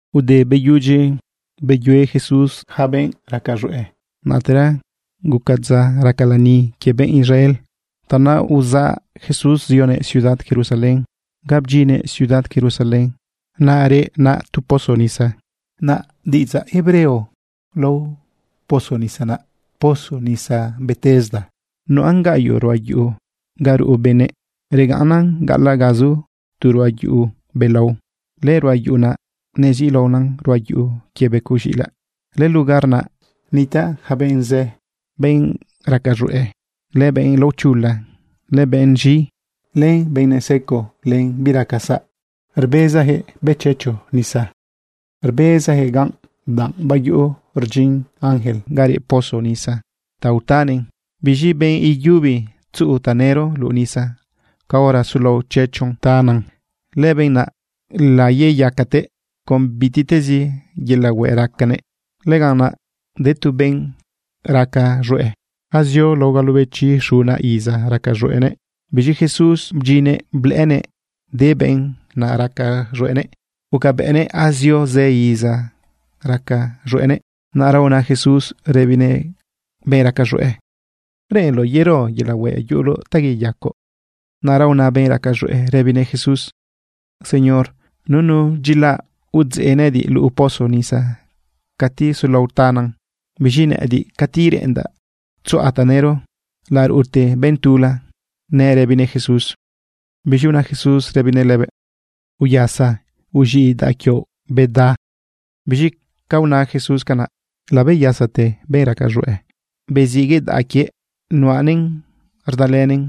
Ude beyudyi beyue Jesús yaca benꞌ raca z̃hueꞌ, naꞌtera guca dza raca lani quie benꞌ Israel. Tanaꞌ uzaꞌ Jesús zionëꞌ ciudad Jerusalén. Ga bdyinnëꞌ ciudad Jerusalén, naꞌ reꞌ naꞌ tu pozo nisa. Naꞌ diꞌidzaꞌ hebreo lao pozo nisa naꞌ pozo nisa Betesda. Nuꞌan gaꞌyoꞌ ruꞌa yuꞌu ga ruꞌu benëꞌ. Regaꞌnnan gaꞌalaꞌ ga zu tu ruꞌa yuꞌu belao. Lëruꞌa yuꞌu naꞌ neziꞌlaona ruꞌa yuꞌu quie becoꞌ z̃iꞌilaꞌ. Lëlugar naꞌ nitaꞌ yaca benꞌ zë, benꞌ raca z̃hueꞌ, len benꞌ laochula, len benꞌ z̃i, len benꞌ neseco biraca saꞌ. Rbezayaquëꞌ bëꞌ chechu ta nisa. Rbezayaquëꞌ ganꞌ danꞌ bayuꞌu rdyin ángel ga reꞌ pozo nisa ta utanëꞌn. Biz̃i benꞌ yubi tzuꞌu tanëro luꞌu nisa caora sulao chechu tanan, lëbenꞌ naꞌ laiyacate con bitiꞌtezi yelaꞌ hueꞌ racanëꞌ. Lëganꞌ naꞌ de tu benꞌ raca z̃hueꞌ azio lao galobechi xuna iza raca z̃hueꞌnëꞌ. Biz̃i Jesús bdyinnëꞌ blëꞌënëꞌ de benꞌ naꞌ raca z̃hueꞌnëꞌ, gucabëꞌnëꞌ azio zë iza raca z̃hueꞌnëꞌ. Naꞌra una Jesús rëbinëꞌ benꞌ raca z̃hueꞌ: ―¿Reꞌenloꞌ yero yelaꞌ hueꞌ yuꞌuloꞌ ta yeyacoꞌ? Naꞌra una benꞌ raca z̃hueꞌ rëbinëꞌ Jesús: ―Señor, nunu dyilaꞌ udzeꞌ nëꞌëdiꞌ luꞌu pozo nisa cati sulao tanan. Biz̃i nëꞌëdiꞌ, cati reꞌendaꞌ tzuꞌa tanëro, laruꞌute benꞌ tula. ―nëꞌ rëbinëꞌ Jesús. Biz̃i una Jesús rëbinëꞌ lëbëꞌ: ―Uyasa, uz̃iꞌ daꞌa quioꞌ, beda. Biz̃i ca una Jesús canaꞌ, labeyasate benꞌ raca z̃hueꞌ, beziꞌguëꞌ daꞌa quiëꞌ nuꞌanëꞌn rdalënëꞌn.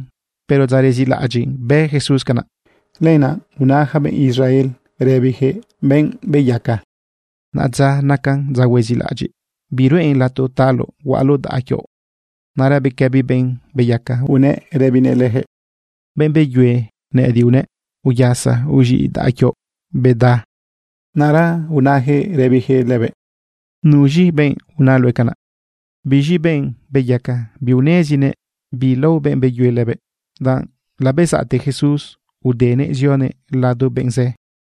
Pero dza rezilaꞌadyiꞌ bë Jesús canaꞌ. Lenaꞌ una yaca benꞌ Israel rëbiyaquëꞌ benꞌ beyaca: ―Naꞌadza nacan dza huezilaꞌadyiꞌ. Biruꞌen lato taloꞌ huaꞌaloꞌ daꞌa quioꞌ. Naꞌra bequëbi benꞌ beyaca unëꞌ rëbinëꞌ leyaquëꞌ: ―Benꞌ beyue nëꞌëdiꞌ unëꞌ: “Uyasa, uz̃iꞌ daꞌa quioꞌ beda.” Naꞌra unayaquëꞌ rëbiyaquëꞌ lëbëꞌ: ―¿Nuz̃i benꞌ una luëꞌ canaꞌ? Biz̃i benꞌ beyaca biunezinëꞌ bi lao benꞌ beyue lëbëꞌ, danꞌ labezaꞌte Jesús udenëꞌ zionëꞌ lado benꞌ zë.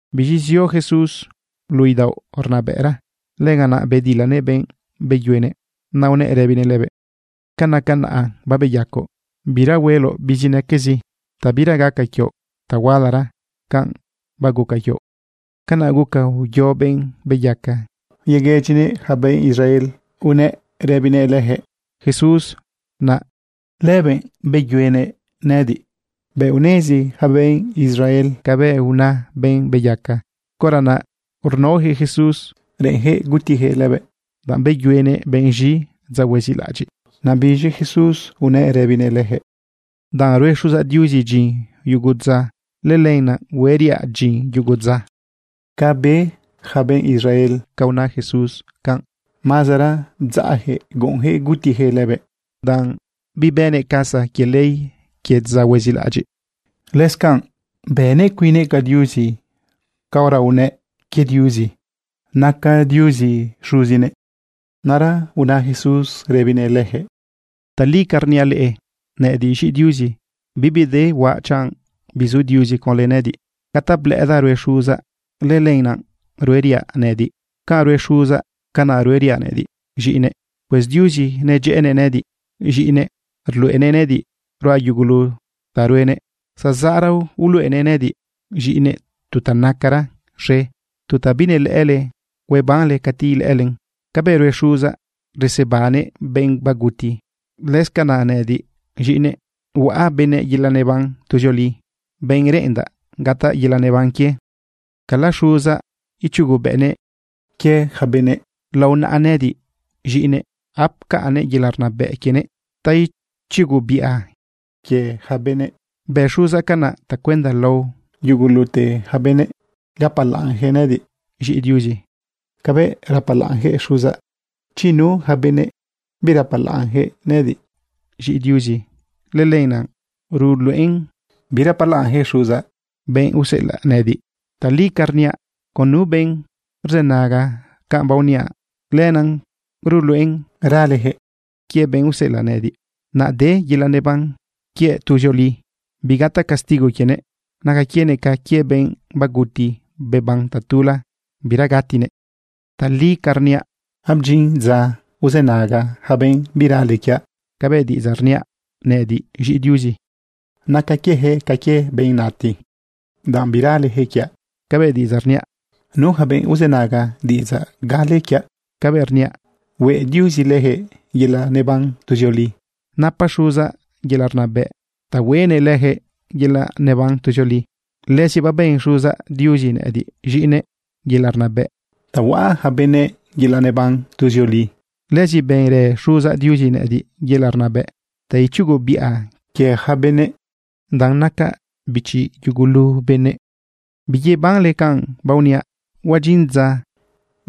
Biz̃i zio Jesús luꞌu idaoꞌ rnabëꞌra. Lëganaꞌ bedilanëꞌ benꞌ beyuenëꞌ, naꞌ unëꞌ rëbinëꞌ lëbëꞌ: ―Canaca naꞌa babeyacoꞌ, bira hueloꞌ bizinaquezi ta bira gaca quioꞌ ta hualara canꞌ baguca quioꞌ. Canaꞌ guca uyo benꞌ beyaca yeguëdyinëꞌ yaca benꞌ Israel, unëꞌ rëbinëꞌ leyaquëꞌ: ―Jesús naꞌ, lëbëꞌ beyuenëꞌ nëꞌëdiꞌ. Bëꞌ unezi yaca benꞌ Israel cabëꞌ una benꞌ beyaca, caora naꞌ rnaojëꞌ Jesús reꞌenyaquëꞌ gutijëꞌ lëbëꞌ, danꞌ beyuenëꞌ benꞌ z̃i dza huezilaꞌadyiꞌ. Naꞌ biz̃i Jesús unëꞌ rëbinëꞌ leyaquëꞌ: ―Danꞌ rue Xuzaꞌ Diuzi dyin yugu dza, lëlenaꞌ hueriaꞌ dyin yugu dza. Ca be yaca benꞌ Israel ca una Jesús canꞌ, mazara bdzaꞌyaquëꞌ guꞌunyaquëꞌ gutiyaquëꞌ lëbëꞌ, danꞌ bibënëꞌ casa quie ley quie dza huezilaꞌadyiꞌ. Lëscanꞌ bënëꞌ cuinnëꞌ ca Diuzi caora unëꞌ quie Diuzi naca Diuzi Xuzinëꞌ. Naꞌra una Jesús rëbinëꞌ leyaquëꞌ: ―Tali ca rniaꞌ leꞌe, nëꞌëdiꞌ z̃iꞌi Diuzi, bibi de huaꞌ chanꞌ bizu Diuzi conlë nëꞌëdiꞌ. Ca ta blëꞌëdaꞌ rue Xuzaꞌ, lëlenaꞌ rueriaꞌ nëꞌëdiꞌ. Canꞌ rue Xuzaꞌ, canaꞌ rueriaꞌ nëꞌëdiꞌ z̃iꞌinëꞌ. Pues Diuzi nedyëꞌënëꞌ nëꞌëdiꞌ z̃iꞌinëꞌ, rluꞌenëꞌ nëꞌëdiꞌ ruaꞌ yugulu ta ruenëꞌ. Zazaꞌra uluꞌenëꞌ nëꞌëdiꞌ z̃iꞌinëꞌ tu ta nacara z̃e, tu ta binelëꞌële huebanle cati ilëꞌëlen. Cabëꞌ rue Xuzaꞌ, resebannëꞌ benꞌ baguti, lëscanaꞌ nëꞌëdiꞌ z̃iꞌinëꞌ, huaꞌa benëꞌ yelaꞌ neban tuzioli, benꞌ reꞌendaꞌ gataꞌ yelaꞌ neban quie. Cala Xuzaꞌ ichugobëꞌnëꞌ quie yaca benëꞌ. Lao naꞌa nëꞌëdiꞌ z̃iꞌinëꞌ napcaꞌnnëꞌ yelaꞌ rnabëꞌ quienëꞌ ta ichugobiꞌa quie yaca benëꞌ. Bë Xuzaꞌ canaꞌ tacuenda lao yugulute yaca benëꞌ gapalaꞌnyaquëꞌ nëꞌëdiꞌ z̃iꞌi Diuzi cabëꞌ rapalaꞌnyaquëꞌ Xuzaꞌ. Chi nu yaca benëꞌ birapalaꞌnyaquëꞌ nëꞌëdiꞌ z̃iꞌi Diuzi, lëlenaꞌ ruluꞌen birapalaꞌnyaquëꞌ Xuzaꞌ, benꞌ useꞌelaꞌ nëꞌëdiꞌ. ’Tali ca rniaꞌ, con nu benꞌ rzënaga canꞌ baoniaꞌ, lenaꞌ ruluꞌen raleyaquëꞌ quie benꞌ useꞌelaꞌ nëꞌëdiꞌ, naꞌ de yelaꞌ neban quiëꞌ tuzioli, bigataꞌ castigo quienëꞌ. Naca quienëꞌ ca quie benꞌ baguti beban tatula, bira gatinëꞌ. Tali ca rniaꞌ, abdyin dza uzënaga yaca benꞌ birale quiaꞌ cabëꞌ diꞌidzaꞌ rniaꞌ nëꞌëdiꞌ z̃iꞌi Diuzi. Naca quieyaquëꞌ ca quie benꞌ nati, danꞌ biraleyaquëꞌ quiaꞌ cabëꞌ diꞌidzaꞌ rniaꞌ. Nu yaca benꞌ uzënaga diꞌidzaꞌ gale quiaꞌ cabëꞌ rniaꞌ, hueꞌ Diuzi leyaquëꞌ yelaꞌ neban tuzioli. Napa Xuzaꞌ yelaꞌ rnabëꞌ ta hueꞌnëꞌ lëjëꞌ yelaꞌ neban tuzioli. Lëzi baben Xuzaꞌ Diuzi nëꞌëdiꞌ z̃iꞌinëꞌ yelaꞌ rnabëꞌ ta huaꞌa yaca benëꞌ yelaꞌ neban tuzioli. Lëzi benrë Xuzaꞌ Diuzi nëꞌëdiꞌ yelaꞌ rnabëꞌ ta ichugobiꞌa quie yaca benëꞌ danꞌ nacaꞌ bichi yugulu benëꞌ. Biyebanle canꞌ baoniaꞌ, huadyin dza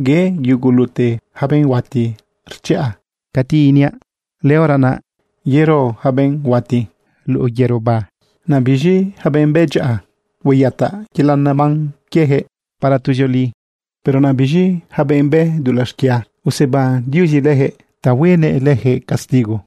ye yugulute yaca benꞌ huati rchiꞌa cati iniaꞌ. Lëhora naꞌ yero yaca benꞌ huati luꞌu yëroba. Naꞌ biz̃i yaca benꞌ bë dyaꞌa hueyataꞌ yelaꞌ neban quieyaquëꞌ para tuzioli. Pero naꞌ biz̃i yaca benꞌ bë dulaꞌ xquia, useban Diuzi leyaquëꞌ ta huenëꞌ leyaquëꞌ castigo.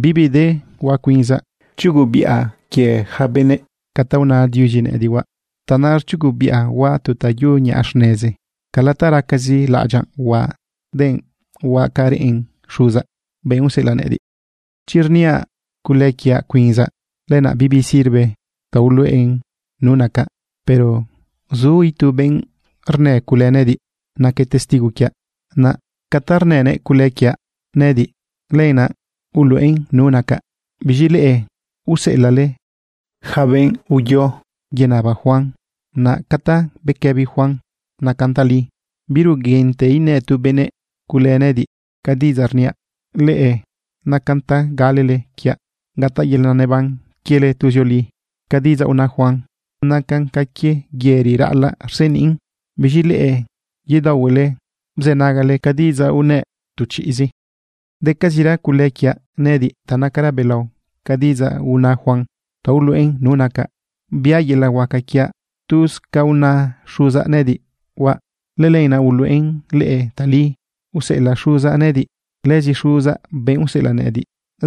’Bibi de huaꞌ cuinzaꞌ. Rchugobiꞌa quie yaca benëꞌ ca ta una Diuzi nëꞌëdiꞌ huaꞌ. Tanaꞌ rchugobiꞌa huaꞌ tu ta yuꞌu niꞌa xnezi. Cala ta racazi laꞌadyaꞌ huaꞌ denꞌ huaꞌ ca reꞌen Xuzaꞌ, benꞌ useꞌelaꞌ nëꞌëdiꞌ. Chi rniaꞌ cule quiaꞌ cuinzaꞌ, lenaꞌ bibi sirve ta uluꞌen nu nacaꞌ. Pero zu itu benꞌ rnë cule nëꞌëdiꞌ naquëꞌ testigo quiaꞌ. Naꞌ ca ta rnënëꞌ cule quiaꞌ nëꞌëdiꞌ, lenaꞌ uluꞌen nu nacaꞌ. Biz̃i leꞌe useꞌelaꞌle yaca benꞌ uyo yenaba Juan. Naꞌ ca ta bequëbi Juan nacan tali. Biruguinte inë tu benëꞌ cule nëꞌëdiꞌ. Ca diꞌidzaꞌ rniaꞌ leꞌe, nacan ta galele quiaꞌ gataꞌ yelaꞌ neban quiele tuzioli. Ca diꞌidzaꞌ una Juan nacan ca quie yëri raꞌalaꞌ rseniꞌn. Biz̃i leꞌe, yedaohuele bzënagale ca diꞌidzaꞌ unëꞌ tu chiꞌzi. Decazira cule quiaꞌ nëꞌëdiꞌ ta nacaran belao ca diꞌidzaꞌ una Juan ta uluꞌen nu nacaꞌ. Biaꞌ yelaꞌ huaca quiaꞌ tuz ca una Xuzaꞌ nëꞌëdiꞌ huaꞌ. Lëlenaꞌ uluꞌen leꞌe tali useꞌelaꞌ Xuzaꞌ nëꞌëdiꞌ. Lëzi Xuzaꞌ, benꞌ useꞌelaꞌ nëꞌëdiꞌ,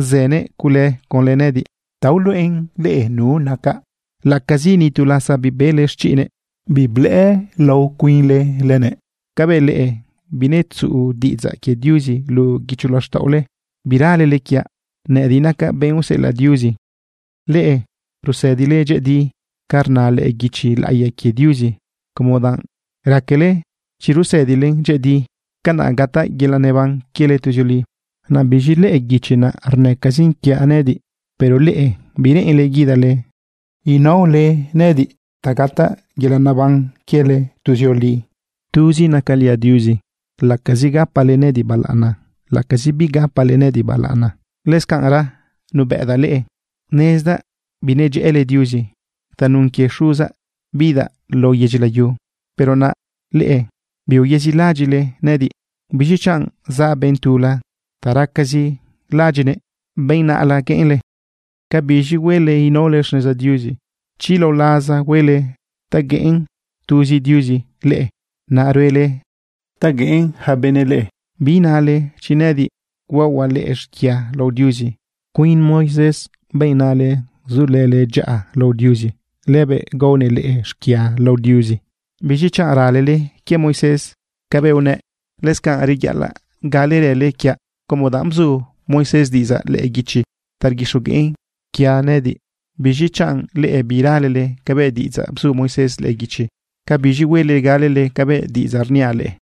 zënëꞌ cule conlë nëꞌëdiꞌ ta uluꞌen leꞌe nu nacaꞌ laꞌacazi nitu lasa bibele xchiꞌnëꞌ, biblëꞌë lao cuinle lënëꞌ. Cabëꞌ leꞌe binetzuꞌu diꞌidzaꞌ quie Diuzi luꞌu guicho laxtaꞌole. Biralele quiaꞌ nëꞌëdiꞌ nacaꞌ benꞌ useꞌelaꞌ Diuzi. Leꞌe rusëdile dyëꞌëdi ca rna lëꞌë guichi laꞌiya quie Diuzi como danꞌ raquele chi rusëdilen dyëꞌëdi, canaꞌ gataꞌ yelaꞌ neban quiele tuzioli. Naꞌ biz̃i lëꞌë guichi naꞌ rnëcazin quiaꞌ nëꞌëdiꞌ. Pero leꞌe, bireꞌenle guidale naole nëꞌëdiꞌ ta gataꞌ yelaꞌ neban quiele tuzioli. ’Tuzi nacaliaꞌ Diuzi laꞌacazi gapale nëꞌëdiꞌ balaꞌana, laꞌacazi bigapale nëꞌëdiꞌ balaꞌana. Lëscanꞌra nubëꞌdaꞌ leꞌe. Nezdaꞌ binedyëꞌële Diuzi. Tanun quie Xuzaꞌ bidaꞌ lao yedyi layu, pero naꞌ leꞌe biuyezilaꞌadyiꞌle nëꞌëdiꞌ. Biz̃i chanꞌ zaꞌ benꞌ tula ta racazi laꞌadyiꞌnëꞌ benꞌ naꞌla gueꞌenle. Cabiz̃i huele inaole xneza Diuzi, chi lao laza huele ta gueꞌen tuzi Diuzi leꞌe, naꞌ ruele ta gueꞌen yaca benëꞌ leꞌe. Biinale chi nëꞌëdiꞌ huaohuaꞌ leꞌe xquia lao Diuzi. Cuin Moisés, benꞌ nale sulële dyaꞌa lao Diuzi, lëbëꞌ gaonëꞌ leꞌe xquia lao Diuzi. Biz̃i chanꞌ ralele quie Moisés cabëꞌ unëꞌ, lëscanaꞌ reyaꞌalaꞌ galerële quiaꞌ, como danꞌ bzu Moisés diꞌidzaꞌ lëꞌë guichi ta rguixogueꞌn quie nëꞌëdiꞌ. Biz̃i chanꞌ leꞌe biralele cabëꞌ diꞌidzaꞌ bzu Moisés lëꞌë guichi, ¿cabiz̃i huele galele cabëꞌ diꞌidzaꞌ rniaꞌ leꞌe?